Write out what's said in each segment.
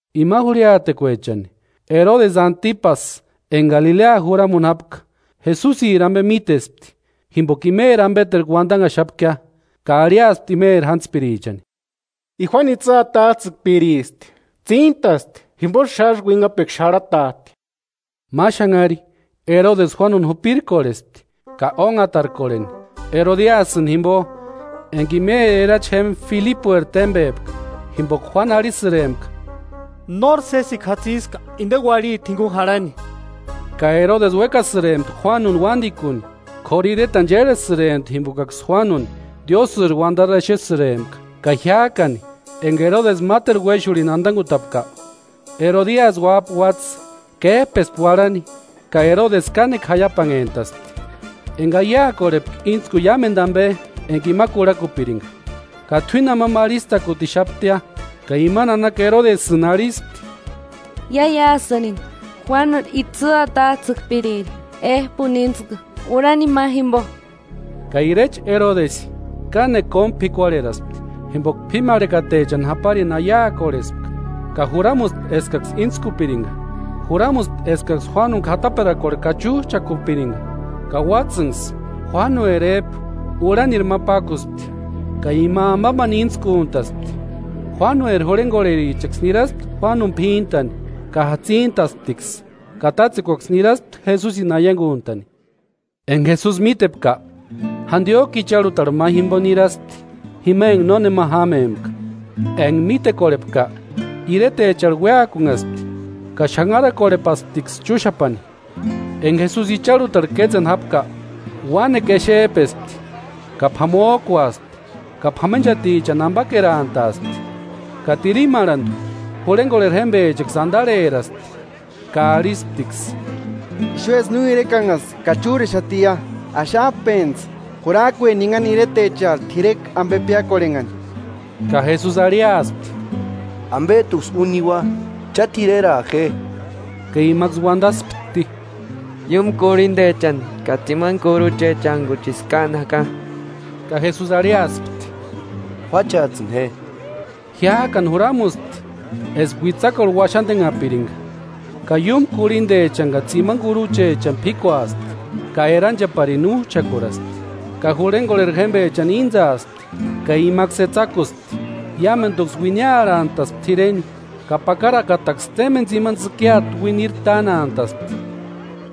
Ima jurhiatekuechani, Erodesi Antipasï enka Galilea juramuni jápka, Jesusiri ampe mítespti, jimpoka imeri ampeterku uantanhaxapkia, ka arhiaspti imeri jántspirichani: “I Juánu itsï atats'ïkpiristi, tsíntasti, jimposï xásï uinhapekua xarhatat'i.” Ma xanhari Erodesi Juánuni jupirkorhespti ka ónhatarkorheni, Erodiasïni jimpo, enka imeri erachi jémpa Filipueri témpepka. Jimpoka Juánu arhisïrempka: “Nóri sésekua jatsiska inteni uarhiti jinkuni jarhani.” Ka Erodesi uékasïrempti Juánuni uántikuni, k'óru iretani chérhesïrempti jimpokaksï Juánuni Diósïri uantarini exesïrempka. Ka jiák'ani enka Erodesi máteru uéxurhini antankutapka, Erodiasï uáp'a uátsï, kép'espti uarhani, ka Erodesi kánekua jaiapanhentaspti, enka aiakorhepka íntskuni iámentu ampe enka ima kurhakupirinka. Ka t'uíni amampa arhistakutixaptia, ka ima nanaka Erodesïni arhispti: “Iáiasïrini Juánu itsï atats'ïkpiriri ép'uni íntsku urhani ma jimpo.” Ka irecha Erodesï kánekua kómu p'ikuarheraspti, jimpoka p'ímarhekatechani japarini aiakorhespka, ka juramuspti eskaksï íntskupirinka. Juramusti eskaksï Juánuni k'ataperakuarhu kachuch'akupirinka. Ka uátsïnksï Juánueri ép'u urhanirhu ma pákuspti, ka ima amampani íntskuntaspti. Juánueri jurhenkorherichaksï niraspti Juánuni p'íntani ka jatsintasptiksï, ka tátsekuaksï niraspti Jesusini aiankunt'ani. Enka Jesusi mítepka, jantiok'u icharhutarhu ma jimpo niraspti jima enka nónema jámempka. Enka mítekorhepka, iretecharhu uéakunhaspti ka xanharakorhepasptiksï chúxapani. Enka Jesusi icharhutarhu kétseni jápka, uánekua exep'espti; ka p'amok'uaspti ka p'amenchatichani ampakerantaaspti. Ka tirimarhantu, jurhenkorheri jémpechaksï antarheraspti ka arhisptiksï: “Ixuesï no irekanhasti ka chúrexatia. Axap'entsï, jurakue ninhani iretecharhu t'irekua ampe piákorhenhani.” Ka Jesusi arhiaspti: “Ampet'uksï úni niua; cha t'ireraa je.” Ka imaksï uantaspti: “Iúmu kurhintechani ka tsimani kuruchechantkuchisï káani jaka.” Ka Jesusi arhiaspti: “Juácheats'ïni je.” Jiák'ani juramuspti eska uitsakuarhu uaxantenhapirinka, ka iúmu kurhintechani ka tsimani kuruchechani p'íkuaspti, ka erancheparini úch'akuraspti, ka jurhenkorheri jémpechani íntsaapti ka imaksï etsakuspti. Iámentuksï uiniarhantaspti t'ireni, ka pakarakataksï témpeni tsimani tsïkiata uiniri tánantaspti.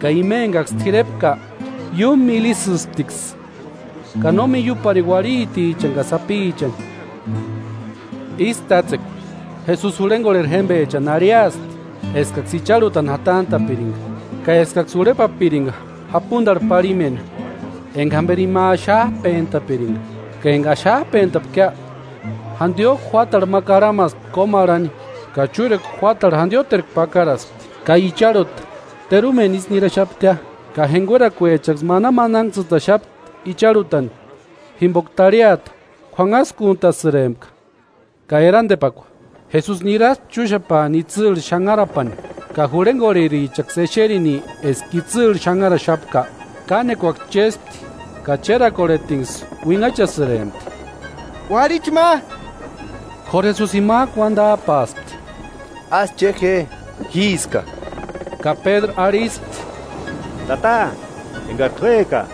Ka ima enkaksï t'irepka iúmu míli ísïsptiksï, ka no miiuaparini uarhitichani ka sapichani. Ísï tátsekua, Jesusi jurhenkorheri jémpechani arhiaspti eskaksï icharhutani jatant'a'pirinka, ka eskaksï urheparinka japuntarhu parhimeni enka jamperi ima axap'entapirinka. Ka enka axap'entapkia, jantiok'u juátarhu ma karhamaspti kómarhani, ka chúrekua juátarhu jantioterku pakaraspti. Ka icharhuta terumeni ísï niraxaptia, ka jenkuerakuechaksï manamananhtsïtaxapti icharhutani jimpoka tarhiata k'uanhaskuntasïrempka. Ka erantepakua, Jesusi niraspti chúxapaani itsïrhu xanharapani. Ka jurhenkorherichaksï exerini eska itsïrhu xanharaxapka, kánekuaksï chéspti ka chérakorhetinksï uinhachasïrempti “¡Uarhicha ma!” K'óru Jesusi jimak'u uantap'aaspti: “¡Ásï che je, jíska!” Ka Pédru arhispti: “Tata enkari t'úeka,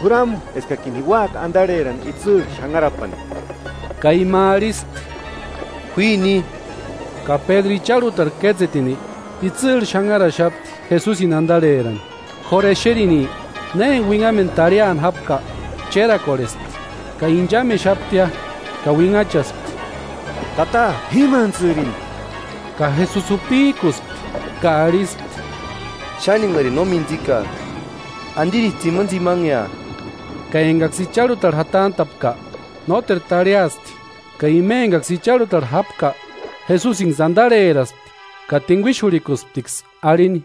juramu eskakini ji úaka antarheraaka itsïrhu xanharapani.” Ka ima arhispti: “Juíni.” Ka Pédru icharhutarhu kétsetini, itsïrhu xanharaxapti Jesusini antarherani. K'óru exerini na enka uinhamentu tarhiani jápka, chérakorhespti ka inchamexaptia. Ka uinhachaspti: “¡Tata p'ímantsïrini!” Ka Jesusi jupik'uspti ka arhispti: “¡Xáni enkarini no mintsikak'a! ¿Antirisï tsimantsimanea?” Ka enkaksï icharhutarhu jatant'a'pka, nóteru tarhiaspti. Ka ima enkaksï icharhutarhu jápka, Jesusinksï antarheraspti ka tinkuixurhikusptiksï arhini: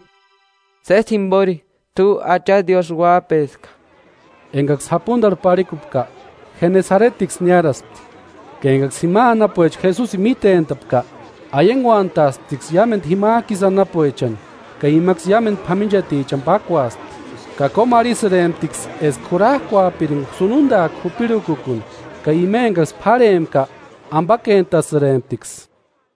“Sési jimpori t'u Acha Diósï Uáp'eska.” Enkaksï japuntarhu parhikupka, Jenesaretiksï niáraspti. Ka enkaksï jima anapuecha Jesusini mítent'apka, aiankuantaasptiksï iámentu jimak'u isï anapuechani, ka imaksï iámentu p'amenchatichani pákuaspti; ka kómarhisïremptiksï eska jurak'uapirinka sununtak'u jupirhukukuni. Ka ima enkaksï p'árhempka ampakentasïremptiksï.